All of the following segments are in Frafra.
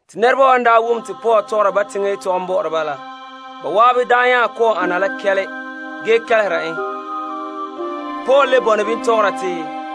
Ban daa wom te Paul tɔgɔra Yudoma yetɔgom bɔ'ɔra ba la, ba zan'an nya kɔ'ɔn ana la kɛle ge kelehera en. Te Paul le tɔgɔra te,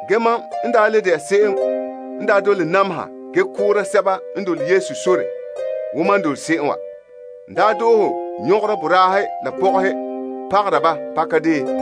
Mam daa de'a se'em n dole namehe ge koora sɛba n dole Sore la. N daa doohe nyɔgera boraahe la pɔgɔhe pagara ba pakadeen.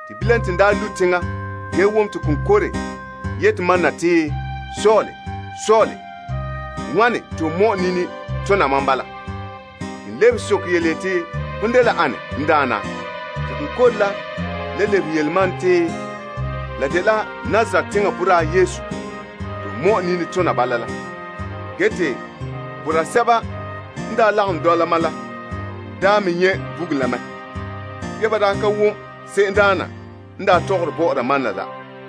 Bilam te n lu' teŋa ge wom te konkore yete mam na te, Saul, Saul, wane te ho nameha mam bala? N lebehe soke yeti, Hon dela ane, n Daana? Te konkore la le lebehe yele mam te, Mam dela Nazaret teŋa boraa Yesu te ho nameha. Boraa sɛba n daa lagom dɔla mam la me nyɛ' bugum la mɛ, be ba ka wom se'emdaana n tɔgɔre bɔ'ɔra mam na la.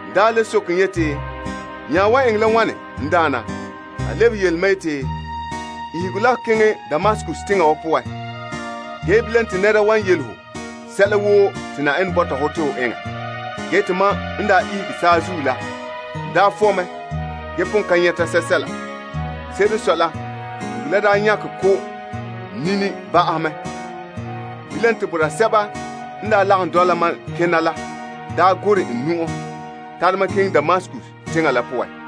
N le soke en yeti, N nya wan eŋɛ la wane, n Daana? Te a lebehe yele mam yeti, Ihege la ho keŋɛ Damaskus teŋa wa poan. Bilam te nɛra wan yele ho sɛla woo te Yenɛ bɔta hɔ te ho eŋɛ. Mam n daa ihege saazuo la, n fɔ' mɛ ge pon ka nyɛta sɛsɛla. Se'ere n sɔe la, bugum la daa nyakɛ ko' n nini ba'ahɛ mɛ. Te boraa sɛba n daa lagom dɔla mam kena la gorɛ n nu'o tare mam keŋɛ Damaskus teŋa la poan.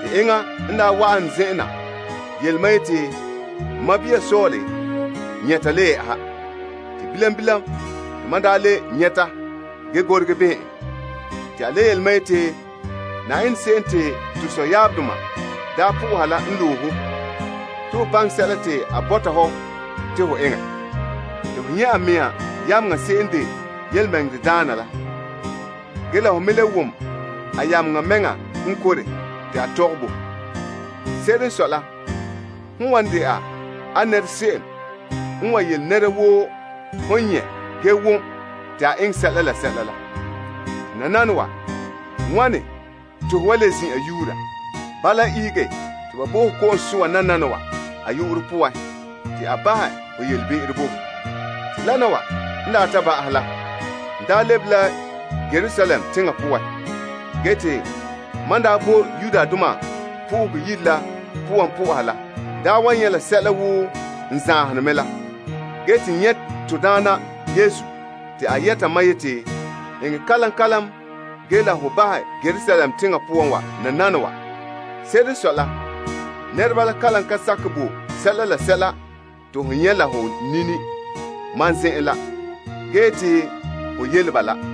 Enŋa n daa wa'an n zen'en na yele mam yeti, N sɔɔn Saul, nyɛta le yɛ'ɛha. Te bilam bilam te mam daa le nyɛta ge gorege behɛ en. A le yele ma yeti, To sɔyaabdoma Yenɛ loe ho te ho baŋɛ sɛla te a bɔta hɔ te ho eŋɛ. Te ho nyɛ' a mea yameŋa se'em n de tontɔɔdaana la ge ho me le wom a yameŋa mɛŋa konkore te a tɔgɛ bo ho. Se'ere n sɔe la hon wan de'a a nɛrese'em n wa yele nɛra woo hon nyɛ' ge wom te a eŋɛ sɛla la sɛla la. Te nananawa, wane te ho wa le zin'an yuura? Bala, ihege te ba bo ho ko'om soa a yu'urɛ poan te a bahɛ ho be'em bo ho. Te lana wa n daa ta ba'ahɛ la, n lebe la Yerusalem. Mam boe Yenɛ Yire la poan po'oha la, n nyɛ' la sɛla woo n zahene mɛ la. N nyɛ' to Daana te a yɛta ma yeti, Eŋɛ kalam kalam ge la ho bahɛ Yerusalem teŋa poan wa nanana nananawa. Se'ere n sɔe la nɛreba la kalam ka sakɛ bo sɛla la sɛla te ho nyɛ' la ho nini mam zen'en la ge yete ho yele ba la.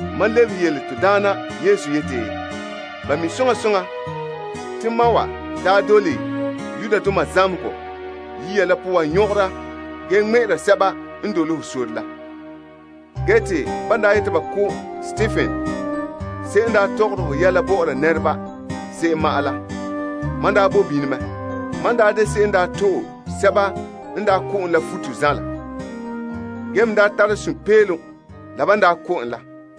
Mam lebehe te, N Daana, ba mi' soŋa soŋa te mam wa daa dole zamehegɔ yiya la poan nyɔgera ge ŋmɛ'ɛra sɛba n dole ho sore la. Ge te ban daa yete ba ko' Stepen se'em n daa tɔgɔre ho yɛla bɔ'ɔra nɛreba, se'em ma'an la, mam bo bini mɛ. Ge mam n de se'em n to'e sɛba n ko' en la futo zanla. Ge n me tara sunpeelom la ban ko' en la.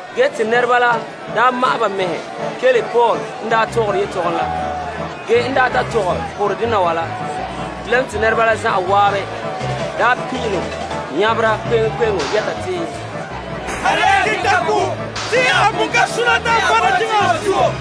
Nɛreba la daa ma'ɛn ba mɛhe kelehe Paul n tɔgɔre a yetɔgom la, ge en ta tɔgɛ porɛ dena wa la, bilam te ba la zan'an pin'ilom nyabera kpe'eŋkpe'eŋo yɛta te, Tare ya n keŋɛ ta ko! A pon ka sona te a vɔna teŋa wa zuo!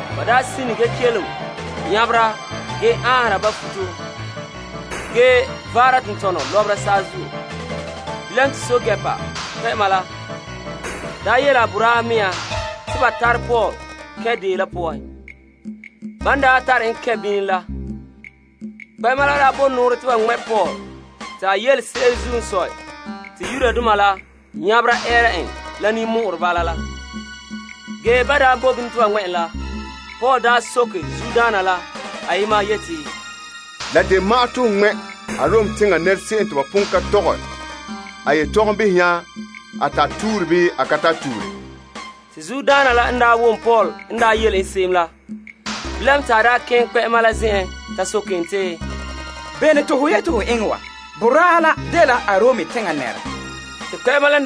Ba sine ge kelom nyabera ge aanhera ba futo ge vaara tentɔnɔ lɔbera saazuo. Pɛɛntɛɛnreba kpɛ'ɛma la yele a boraahe mea te ba tare Paul kɛn' deo la poan. Ban tare en kɛn' bini la, kpɛ'ɛma la bo nɔɔrɛ te ba ŋmɛ' Paul te a yelese'ere zuo n sɔe la Yudoma la nyabera ɛɛra en la ninmɔ'ɔrɛ bala la. Ge ban bo bini te ba ŋmɛ' en la, Paul soke zuodaana la ayema yeti, La de ma'an te ho ŋmɛ' Arom teŋa nɛrese'em te ba pon ka tɔgɛ a yetɔgom behɛ nya a tare tuure bii a ka tare tuure? Zuodaana la n wom Paul n yele en se'em la, bilam te a keŋɛ kpɛ'ɛma la zen'en ta soke en te, Bene te ho yete ho eŋɛ wa? Boraa la dela Arom teŋa nɛra! Te kpɛ'ɛma la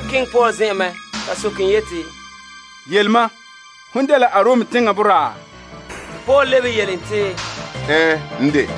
keŋɛ Paul zen'en mɛ ta soke en yeti, Yele mam, hon dela Arom teŋa boraa? Paul lebehe yele en te, Ɛɛn, n de.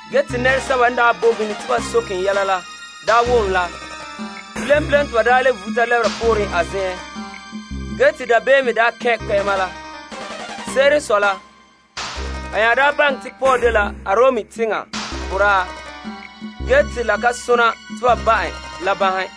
Nɛresɛba n boe bini te ba soke en yɛla la n wom la, bilam bilam te ba le vuta lɛbera pooren a zen'en ge dabeem kɛn' kpɛ'ɛma la. Se'ere n sɔe la, a nya baŋɛ ya te Paul dela Arom teŋa boraa ge te la ka sone te a bahɛ te ba ba' en la banhe.